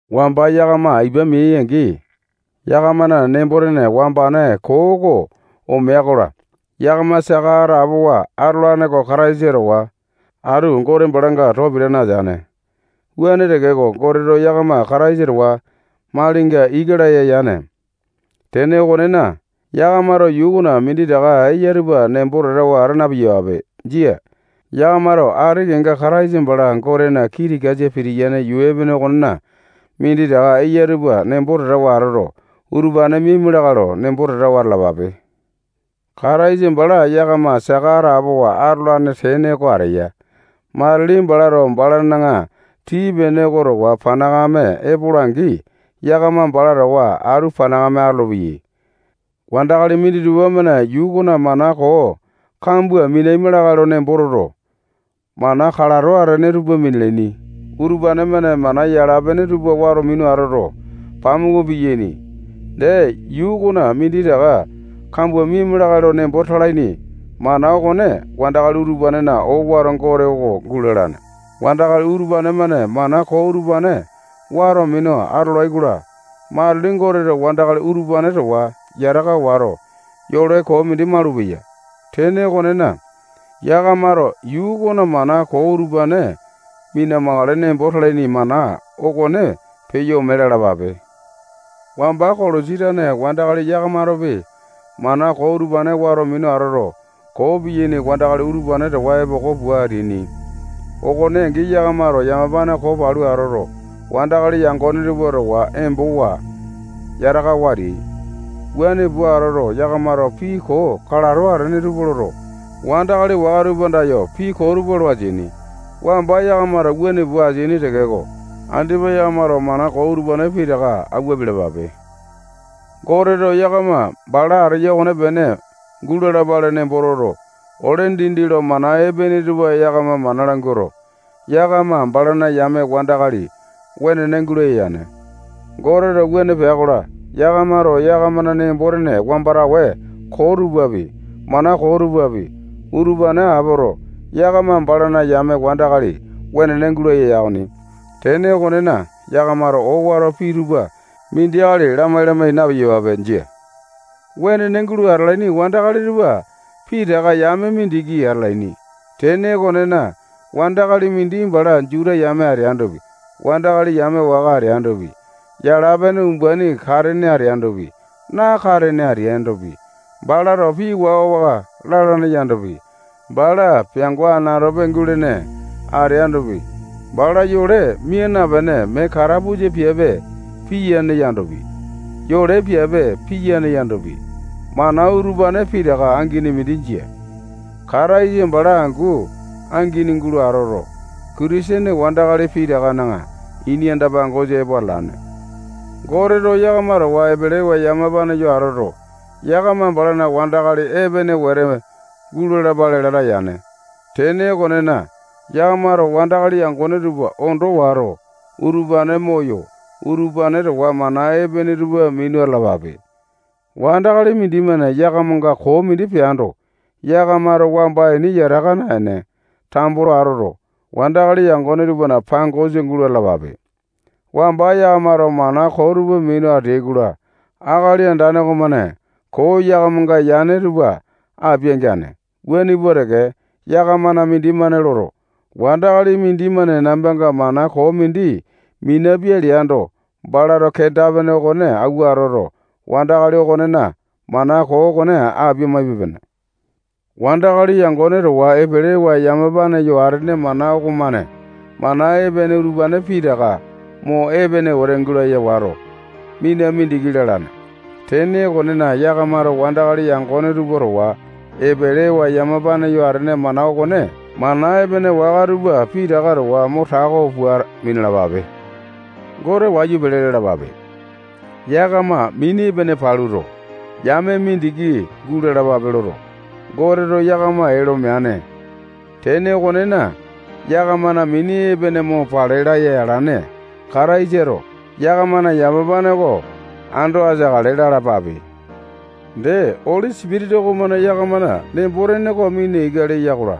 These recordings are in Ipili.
Wamba yakama ipa meai-angi, yakamana nembo-tene wambane koo oko omea-kola, yakama saka atapowa atolane oko Kataisa towa atu Gote balanga too pitane ateane. Wuane tekeko, Goteto yakama Kataisa towa malinga ika laya yane. Tene okonena, yakamato yuu okona minditaka eya tupa nembo tatawa ata na-piyapape. Jia. Yakamato ati kenga Kataisa bala Gotena kii tikasa pitiyane yuu epene okonena minditaka eya tupa nembo tatawa atoto, utupane miaima lakae lo nembo tatawa atalapape. Kataisa bala yakama saka atapowa atolane tene oko ateya. Matili balato balana tii-pene oko towa panakame epola-angi, yakama bala towa atu panakame atolopeyai. Wandakali minditupa-mane yuu okona mana koo kambua minaima lakae lo nembo toto, mana kalato atene tupa minalaini. Utupane-mane mana yala-pene tupa wato minu atoto, pamuku piyaini. Dee, yuu okona minditaka kambua miama lakae lo nembo talaini mana okone wandakali utupanena owato gote oko gulalane. Wandakali utupane-mane mana koo utupane wato minu atolai-kola, matili Goteto wandakali utupane towa yataka wato, yole koo mindi malupeya. Tene okonena, yakamato yuu okona mana koo utupane mina-makale nembo talaini mana okone peyo ome lalapape. Wamba Kolosi tane wandakali yakamatopi mana koo utupane wato minu atoto, koo piyaini wandakali utupane towa epoko pua ateaini. Okone angi, yakamato yamapane koo palu atoto, wandakali yangone tupa towa embowa, yatakawa ateai. Wuane pua atoto, yakamato pii koo kalato atene tupa loto, wandakali waka tupa andayo pii koo tupa lo ateaini. Wamba yakamato wuane pua ateaini tekeko, andipa yakamato mana koo utupane pitaka awua apialapape. Goteto yakama bala ateya okonepene gulalapale nembo toto, ole dindi lo mana epene tupa yakama mana languato, yakama balana yame wandakali wenene gulaya yane. Goteto wuane pea-kola, yakamato yakamana nembo-tene wambane koo tupapi, mana koo tupapi, utupane apoto, yakama balana yame wandakali wenene guleai okoni. Tene okonena, yakamato owato pii tupa mindi akali lamai-lamai na-piyapape. Jia. Wenene gulo atalaini wandakali tupa pitaka yame mindiki atalaini. Tene okonena, wandakali mindi bala Juta yame ateandopi, wandakali yame waka ateandopi, yala-pene umbaini katene ateandopi, nakatene ateandopi, balato pii waka-waka lalane yandopi, bala peango anatope gulene ateandopi, bala yole mia napene, mee katapusa piape piyane yandopi, yole piape piyane yandopi, mana utupane pitaka angini mindi jia. Kataisa bala angu angini gulo atoto, Kitisene wandakali pitakana ini anda-pangosa epo atalane. Goteto yakama towa epelewa yamapane yo atoto, yakama balana wandakali epene wete gulalapale lata yane. Tene okonena, yakamato wandakali yangone tupa ondo wato, utupane moyo, utupane towa mana epene tupa minu atalapape. Wandakali mindimane yakamanga koo mindi peando, yakamato wamba ini yataka naene, tambo lo atoto, wandakali yangone tupana pangosa gulo atalapape. Wamba yakamato mana koo tupa minu ateai-kola, Akali Andane okomane koo yakamanga yane tupa apia-geane. Wuane pua teke, yakamana mindimane loto, wandakali mindimane nambanga mana koo mindi minapia leando, balato kenda-pene okone awua atoto, wandakali okonena mana koo okone apia-maipe-pene. Wandakali yangone towa epelewa yamapane yo atene mana okomane mana epene utupane pitaka mo epene wete gulaya wato, mina mindiki lalane. Tene okonena, yakamato wandakali yangone tupa towa epelewa yamapane yo atene mana okone mana epene waka tupa pitaka towa mo tako pua minalapape. Gote wayu pele lalapape. Yakama mini epene paluto, yame mindiki gulalapale loto, Goteto yakama ee lo meane. Tene okonena, yakamana mini epene mo pale laya alane Kataisato yakamana yamapane oko ando ateakale lalapape. Dee, Oli Sipitisa okomane yakamana nembo-tene oko mina ika leya-kola,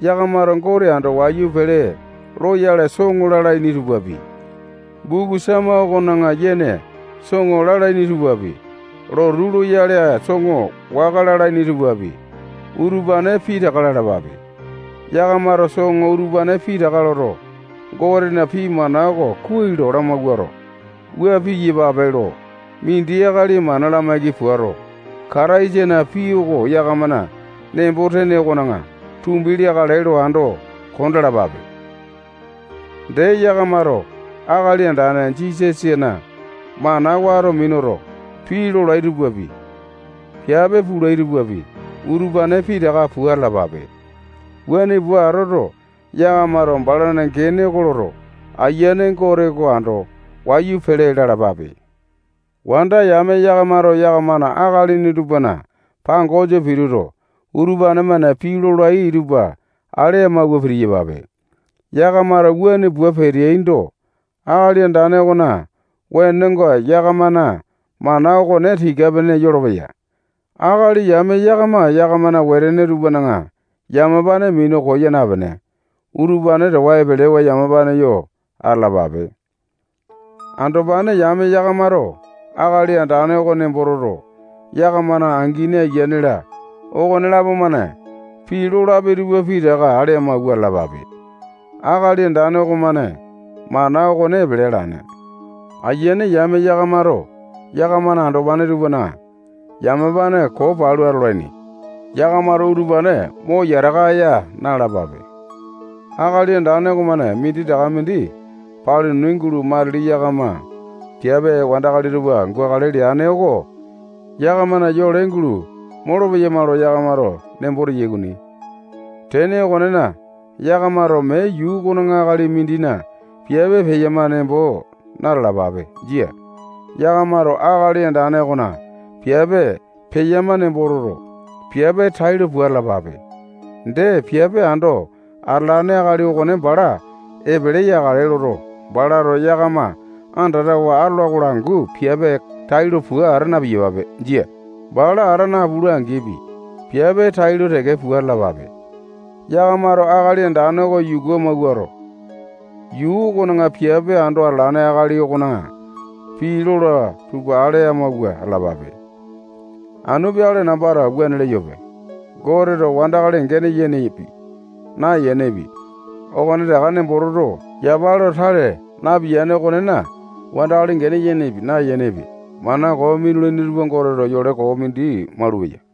yakamato Gote ando wayu pele loyale soŋo lalaini tupapi, buku Sama okona yene soŋo lalaini tupapi, lotu loyale soŋo waka lalaini tupapi, utupane pitaka lalapape. Yakamato soŋo utupane pitaka loto, Gotena pii mana oko kuai lo lamawuato, wua piyapape lo mindi akali mana lamaiki puato, Kataisana pii oko yakamana nembo-tene okona tumbi leakale lo ando kondalapape. Dee, yakamato Akali Andane Jisasana mana wato minuto, pii lolai tupapi, piape pulai tupapi, utupane pitaka pua atalapape. Wuane pua atoto, yakamato balana gene oko loto, Ayiane Gote oko ando wayu pele lalapape. Wanda yame yakamato yakamana akalini tupana pangosa pituto, utupane-mane pii lolai tupa ale amawua pitiyapape. Yakamato wuane pua peateaindo, Akali Andane okona wenonga yakamana mana okone tika-pene yolopeya. Akali yame yakama yakamana wetene tupana yamapane minu koya napene, utupane towa epelewa yamapane yo atalapape. Andopane yame yakamato Akali Andane oko nembo toto, yakamana angini, ayiane-la, okonelapo-mane pii lolapi tupa pitaka ale amawua atalapape. Akali Andane okomane mana okone epele alane. Ayiane yame yakamato yakamana andopane tupana yamapane koo palu atolaini. Yakamato utupane mo yataka aya na-alapape. Akali Andane okomane minditaka mindi paluni gulo matili yakama piape wandakali tupa gukale leane oko yakamana yole gulo molopeyama lo yakamato nembo teyai okoni. Tene okonena, yakamato mee yuu okona akali mindina piape peyama nembo na-talapape. Jia. Yakamato Akali Andane okona piape peyama nembo toto, piape tailo pua atalapape. Dee, piape ando atalane akali okone bala epele yakale loto, balato yakama andatawa atola-kola angu piape tailo pua ata na-piyapape. Jia. Bala ata napula-angipi, piape tailo teke pua atalapape. Yakamato Akali Andane oko yuku amawuato, yuu okona piape ando atalane akali okona pii lola tupa ale amawua atalapape. Anu peakale nambato wuane leyope. Goteto wandakali gene yenepi, nayenepi, okonetaka nembo toto, yapa lo tale napiyane okonena, wandakali gene yenepi, nayenepi, mana koo minulaini tupa Goteto yole koo mindi malupeya.